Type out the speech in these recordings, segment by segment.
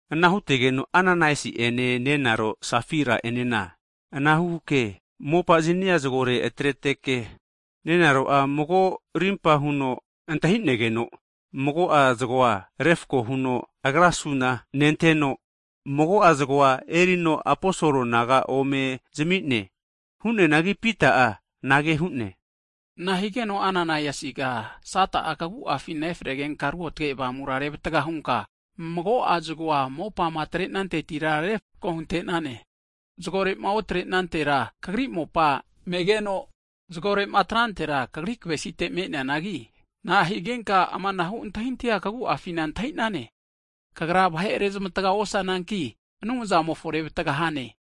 Ana hutegeno Ananaiasi ene nenaro Safaira enena anahuke, mopa zania zagore atreteke, nenaro'a mago rimpa huno antahi'negeno, mago'a zagoa refako huno agra suna nenteno, mago'a zagoa erino aposol naga ome zami'ne. Hu'neanagi Pita'a anage hu'ne, nahigeno Ananaiasiga Sata'a kaguafina efregenka ruotge Avamura revataga hunka mago'a zgoa mopama atrantetira refko hunte'nane? Zagore'ma otre'nantera, kagri mopa megeno, zagore'ma atrantera, kagri kavesite me'neane. Na'a higenka amanahu antahintahia kagu'afina antahi'nane? Kagra vahe rezmataga osananki, Anumzamofo revtaga hane.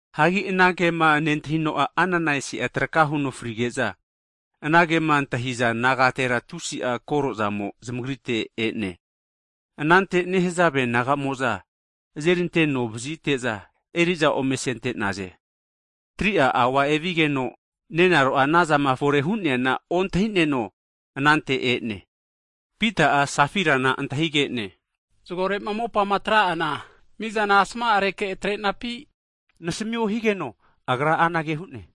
Hagi anankema nentahino'a, Ananaiasi'a traka huno frige'za, anankema antahiza nagatera tusi'a kore'zamo zamagrite e'ne. Anante nehazave nagamo'za azeri anteno vazite'za, eri'za ome asente'naze. Tri'a aua evigeno nenaro'a anazama fore hu'neana ontahineno anante e'ne. Pita'a, anage huno Safairana antahige'ne, zgorema mopama atra'ana, mizana asma'areke atrenampi? nasamio higeno agra anage hu'ne,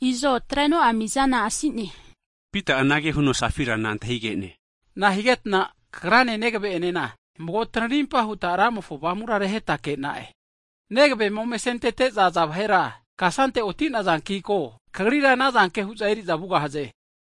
Izo atreno'a mizana asi'ne higeno, Pita'a amanage huno Safairana asamine, Nahigetna kagrane negave'enena mago tanarimpa huta Ramofo Avamura reheta nega'e? Negavema ome asentete'za aza vahera, kasante oti'nazanki ko, kagrira anazanke hu'za eri'za vugahaze.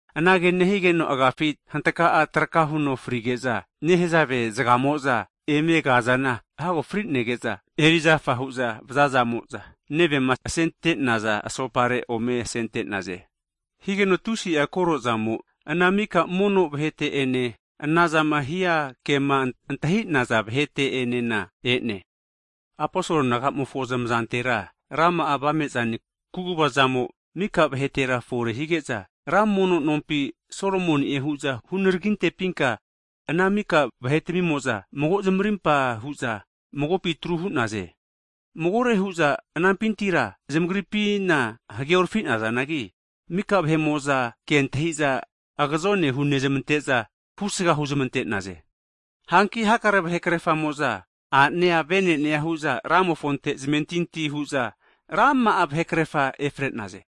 Anage nehigeno agafi hantaka'a traka huno frige'za, nehazave zgamo'za emegazana hago fri'nege'za, erizafa hu'za vazazamo'za, nevema asente'naza asopare ome asente'naze. Higeno tusi'a kore zamo ana mika mono vahete'ene, ana zama hia kema antahi'naza vahete enena e'ne. Aposol nagamofo zamazantera, rama'a avame'zane, kuguva zamo mika vahetera fore hige'za, ra mono nompi, Solomoni'e hu'za hunaraginte'pinka ana mika vahe'tamimo'za mago zamarimpa huza magopi atru hu'naze. Magore hu'za anampintira zamagripina hageorafi'nazanagi, mika vahe'moza kentahiza, agazone hunezmante'za husga huzmante'naze. Hanki hakare vahe krerfamo'za a'nea, venenea hu'za Ramofonte zamentintia hu'za, rama'a vahekrerfa efre'naze.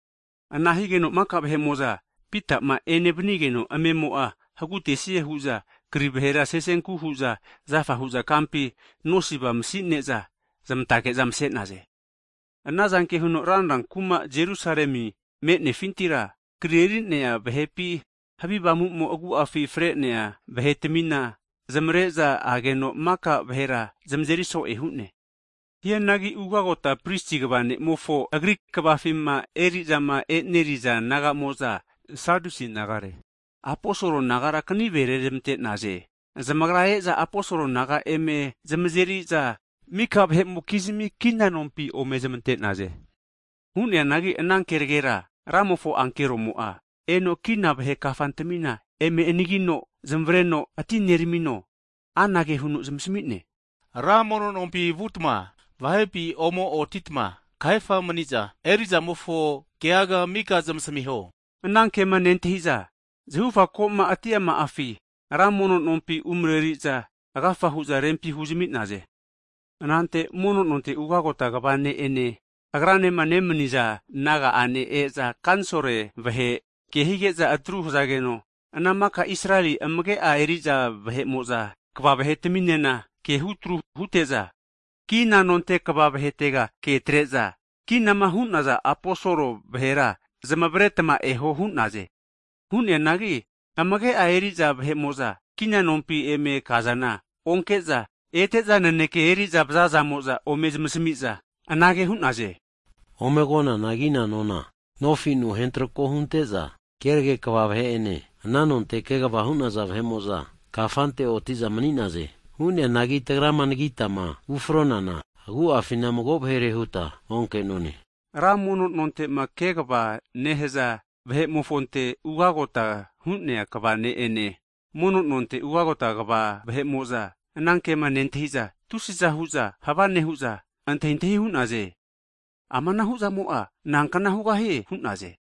Ana higeno mika vahe'mo'za Pita'ma ene vanigeno, amemo'a hagutesie huza kri vahera sesenku huza zafa hu'za kampi, nosiva masi'ne'za zmantage'za mase'naze. Anazanke huno ranra kuma'ma Jerusalemi me'nefintira, kari'erinea vahepi, havi avamu'mo agu'afi fre'nea vahe tmina zamare'za ageno, maka vahera zamazeri so'e hu'ne. Hianagi ugagota prisi kva ne'mofo, agri kvafima erizama e'neri'za nagamo'za, (sadusi nagare) aposol nagara kanive rezmante'naze. Zamagra e'za aposol naga eme zamazeri'za mika vahe'mokizmi kina nompi omezmante'naze. Hu'neanagi ana kenegera Ramofo ankeromo'a eno kina vahe kafantmina eme anagino, zamareno atineramino, anage huno zamasmi'ne, Ra mono nompi vutma vahepi omo otitma kahefa mani'za eri'zamofo keaga mika zamasmiho. Anankema nentahiza, zahufa ko'ma atiama'afi, ra mono nompi umareri'za agafa hu'za rempi huzami'naze. Anante mono nonte ugota kva ne'ene (hae pris), agranema nemni'za naga'ane e'za, kanisol (Senhidren) vahe ke hige'za atru nehazageno, ana maka Isareli kva vahetminena ke hutru hute'za, kina nonte kva vahetega ke atre'za, kinama hu'naza aposol vahera zamaretma eho hu'naze. Hu'neanagi kina nonte eri'za vahe'mo'za kina nompi eme kazana onke'za, ete'za naneke eri'za vazazamo'za ome zamasmi'za, anage hu'naze, Ome konana kina nona nofinu hentrako hunte'za, kerage kva vahe'ene ana nonte kegva hu'naza vahe'mo'za kafante otiza mani'naze. Hu'neanagi tagrama anagitama ufronana, agu'afina mago vahere huta onke'none. Ra mono'nontema kegva nehaza (tempol kat) vahe'mofonte ugagota hu'nea kva ne'ene, mono nonte ugota kva (hae prisi) vahe'mo'za anankema nentahi'za, tusi'za hu'za hava nehu'za antahintahi hu'naze. Amanahu'zamo'a nankna hugahie hu'naze.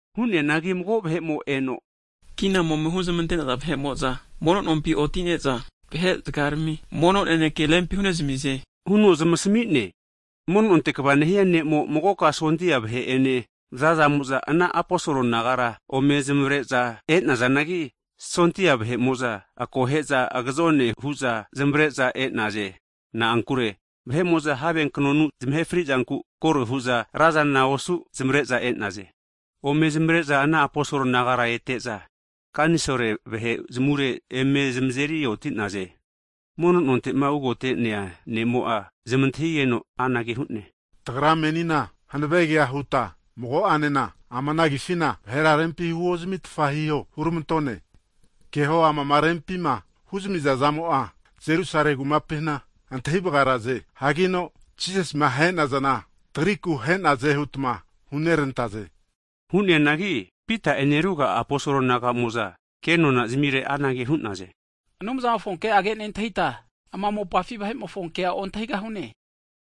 Hu'neanagi mago vahe'mo eno, kinama ome huzmante'naza vahe'mo'za, mono nompi otine'za, vahe'zgarmi mono naneke rempi hu'nezmize huno zamasmi'ne. Mono nonte kva nehia ne'mo'a, magoka sondia vahe'ene vazazamo'za, ana aposol nagara ome zamavare'za e'nazanagi, sondia vahe'mo'za akohe'za agazone hu'za zamavare'za e'naze. (Na'ankure vahe'mo'za have knonu zamahe frizanku kore hu'za razana osu zamare'za e'naze.) Ome zamare'za ana aposol nagara ete'za kanisol (Senhidren) vahe zamure eme zamazeri oti'naze. Mono nontema ugote'nea nemo'a (hae prisi) zamantahigeno anage hu'ne, tagra menina hanave kea huta, mago'anena ama ana agifina vahera rempi huozmitfa hiho huramantone. Keho amama rempima huzamiza zamo'a Jerusale kumapina antahi vgaraze, hankino Jisasima ahe'nazana tagriku ahe'naze hutma huneranta'ze. Hu'neanagi Pita'ene ruga'a aposol nagamo'za kenona zamire anage hu'naze, Anumzamofo ke'age nentahita ama mopafi vahe'mofonkea ontahigahune.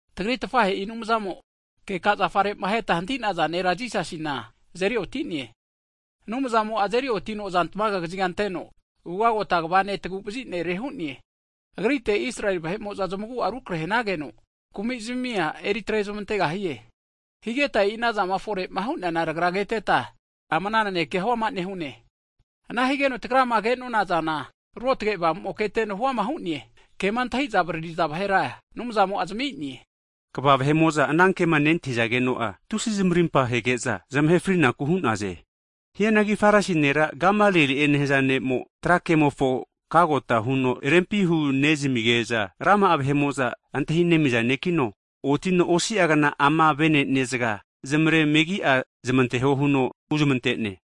Tagri tafahe'i Anumzamo, keka zafarema ahetma hantinaza nera Jisasina azeri otine. Anumzamo'a azeri otino aza tmaga kaziga'a anteno, ugagota kva ne' taguvazi nere hu'ne. Agrite Israeli vahe'mo'za zamagu'a rukrahe hanageno, kumizmia eri atrezmantegahie. Higeta tagra e'i ana zama fore'ma hu'neana keteta, ama anankea hu'ama nehune. Ana higeno tagrama ke'nonazana ruotge Avamumo'a keteno huama hu'ne, kema antahiza avariri'za vahera Anumzamo'a zami'ne. Kva vahe'mo'za anankema nentahi'zageno'a, tusi zamarimpa hege'za zamahe frinaku hu'naze. Hianagi Farisi nera Gamalieli'e nehaza ne'mo tra kemofo (lo) kagota huno rempi hunezmige'za, rama'a vahe'mo'za antahinemiza ne'kino otino, osia kna ama vene'ne zga zamare megi'a zamanteho huno huzmante'ne.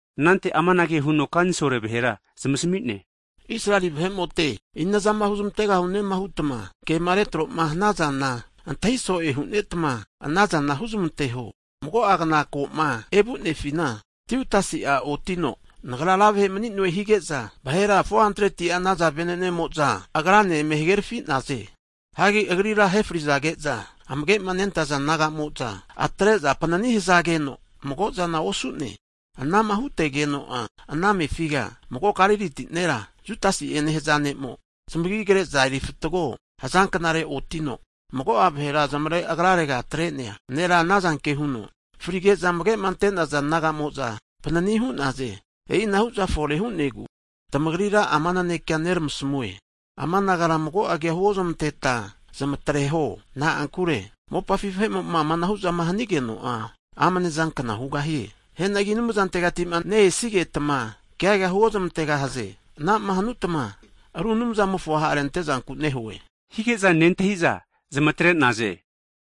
Anante amanage huno kansol vahera zamasmi'ne, Israeli vahe'mote, Inazama huzmante'gahune hutma kema retroma hana'zana, antahi so'e hunetma anazana huzmanteho. Mago'a kna koma evunefina, Tiutasi'a otino, Nagra ra vahe mani'noe hige'za, vahera 400ti'a naza vene'nemo'za, agranena eme hagerafi'naze. Hianagi agrira ahefri'zage'za, amage'ma nentaza naga'moza atre'za panini hazageno mago'zana osu'ne. Anama hutegeno'a ana mefiga, mago Galiliti nera, Judasi'e nehaza ne'mo, zamagi kre'za erifatago haza knare otino, mago'a vahera zamare agrarega atre'nea nera anazanke huno fri'geza amage'ma antenaza naga'mo'za panini hu'naze. E'inahu'za fore hu'negu, tamagrira ama nanekea neramasmue, ama nagara mago kea huozmanteta zamatreho. Na'ankure, mopafi vahe'mo'ma amanahu'zama hanigeno'a, amne'zankna hugahie. Hianagi Anumzantegati'ma ne'esigetma keaga huozmantegahaze. Anama hanutma aru Anumzamofo ha'rentezanku nehue, hige'za nentahi'za zamatre'naze.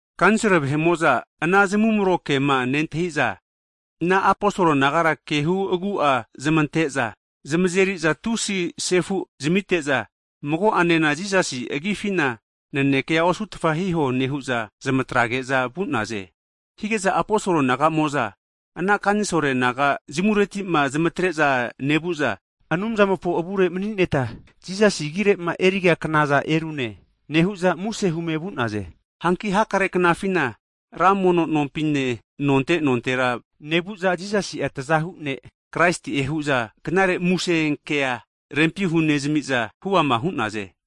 Kanisol vahe'mo'za ana zamumro kema nentahi'za, ana aposol nagara kehu'agu'a zamante'za zamazeri'za tusi sefu zamite'za, mago'anena Jisasi agifina nanekea osutfa hiho nehu'za, zmatrage'za vu'naze. Hige'za aposol nagamo'za ana kanisol naga zamureti'ma zamatre'za nevu'za, Anumzamofo avure mani'neta Jisasi agire'ma eriga knaza erune, nehu'za muse hume vu'naze. Hanki hakare knafina, ra mono nompi'ne, nonte nontera nevu'za Jisasi'a, tazahu ne' Kraisi'e hu'za knare muse kea rempi hunezmi'za huama hu'naze.